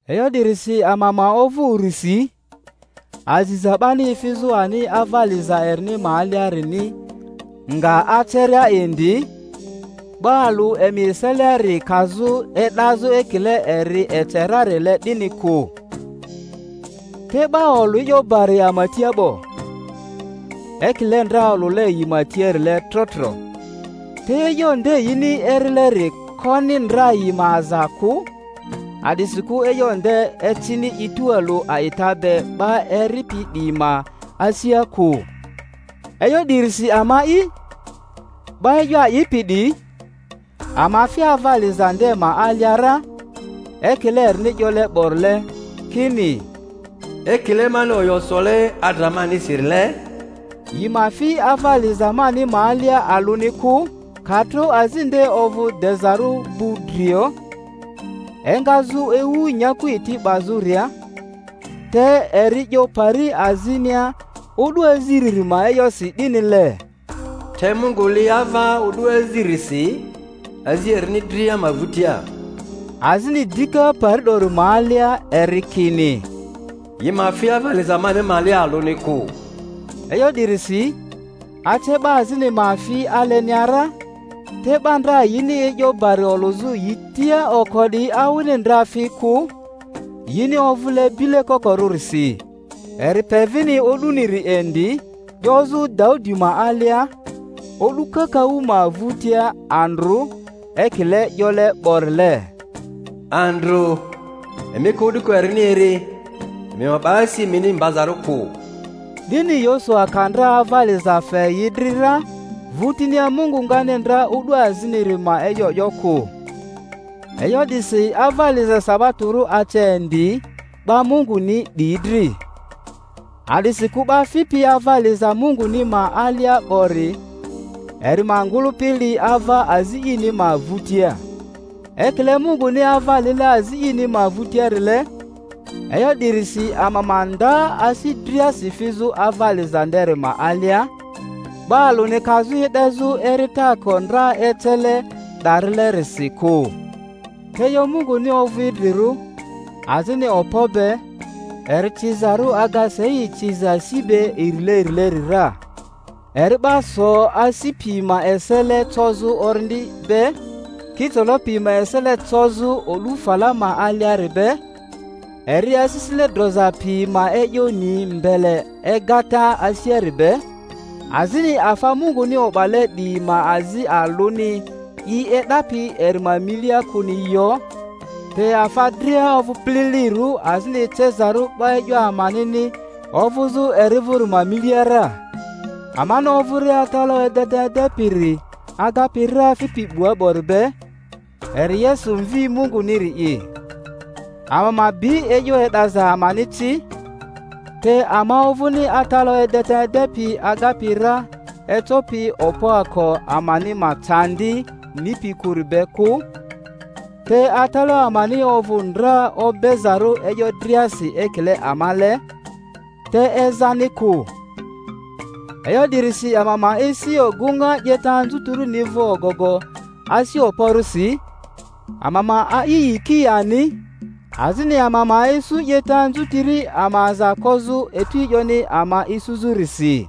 E'yo 'dirisi ama ma ovᴜ urisi, aziza 'bani efizᴜ ani ava liza erini ma aliarini nga aceria indi, 'ba alᴜ emi eseliari kazᴜ e'dazᴜ ekile eri ece rarile 'dini kᴜ. Te 'ba olᴜ e'yo bari ama tia 'bo, ekile ndra olᴜle yi ma tiarile tro tro; te e'yo nde yini erileri koni ndra yi ma aza kᴜ, a'disikᴜ e'yo nde ecini i tualᴜ a'ita be 'ba eripi 'diyi ma asia kᴜ. E'yo 'dirisi ama'i, 'ba e'yo a'ipi 'diyi, ama fi ava liza nde ma alia ra, ekile erini 'yole 'borile, kini, Ekile mani oyo sole adra manisi-rile, Yi ma fi ava liza mani ma alia alᴜni kᴜ, ka tro azi nde ovᴜ dezarᴜ gbudrio, engazᴜ ewu nyaku eti 'bazᴜria. Te eri 'yo pari azinia o'du aziriri ma e'yosi 'dinile, Te Mungu li ava o'du aziririsi azi erini dria ma vᴜtia. Azini dika pari 'dori ma alia eri kini, Yi ma fi ava liza mani ma alia alᴜni kᴜ. E'yo 'dirisi, ace 'ba azini ma fi alenia ra. te 'ba ndra yini e'yo bari olᴜzᴜ yi tia oko 'diyi awini ndra fi kᴜ, yini ovᴜle bile kokorᴜrisi, eri pe vini o'duniri indi, 'yozᴜ Daudi ma alia, o'du kakaᴜ ma vᴜtia, Andrᴜ, ekile 'yole 'borile, Andrᴜ emi ka o'duko erini eri, emi ma 'ba asi emini mbazarᴜ kᴜ. 'Dini Yosua ka ndra ava liza fe yi dri ra, vᴜtinia Mungu ngani ndra o'du aziniri ma e'yo 'yo kᴜ. E'yo 'disi ava liza sabatorᴜ ace indi 'ba Munguni 'diyi dri; a'disikᴜ 'ba fipi ava liza Munguni ma alia 'bori, eri ma ngᴜlᴜpi li ava azi ini ma vᴜtia, ekile Munguni ava lile azi ini ma vᴜtiarile. E'yo 'dirisi ama ma nda asi driasi fizᴜ ava liza nderi ma alia, 'ba alᴜni kazᴜ e'dezᴜ eritaako ndra ecele 'darilerisi kᴜ. Te e'yo Munguni ovᴜ idrirᴜ, azini okpo be, eri cizarᴜ aga sei ciza si be irilerileri ra, eri 'ba so asi pi ma esele cozᴜ orindi be, kicolo pi ma esele cozᴜ odᴜ fala ma aliari be, eri asisile droza pi ma e'yo ni mbele egata asiari be. Azini afa Munguni o'bale 'diyi ma azi alᴜni i e'dapi eri ma milia kᴜni yo, te afa dria ovᴜ pililirᴜ azini ecezarᴜ 'ba e'yo amanini ovuzu eri vuri ma milia ra. Amani ovᴜria atalaᴜ edeta edepiri agapi ra fipi 'bua 'bori be, eri Yesu Mvi Munguniri’i, ama ma bi e'yo e'daza amani ci. Te ama ovᴜni atalaᴜ edeta edepi agapi ra ecopi okpoako amani ma candi nipi kᴜri be kᴜ, te atalaᴜ amani ovᴜ ndra obezarᴜ e'yo driasi ekile amale, te ezani kᴜ. E'yo 'dirisi ama ma esi ogᴜŋa 'yeta anzutirini vᴜ ogogo asi okporᴜsi, ama ma a'i yiki ani, azini ama ma isu 'yeta anzutiri ama aza kozᴜ etu e'yoni ama isuzᴜrisi.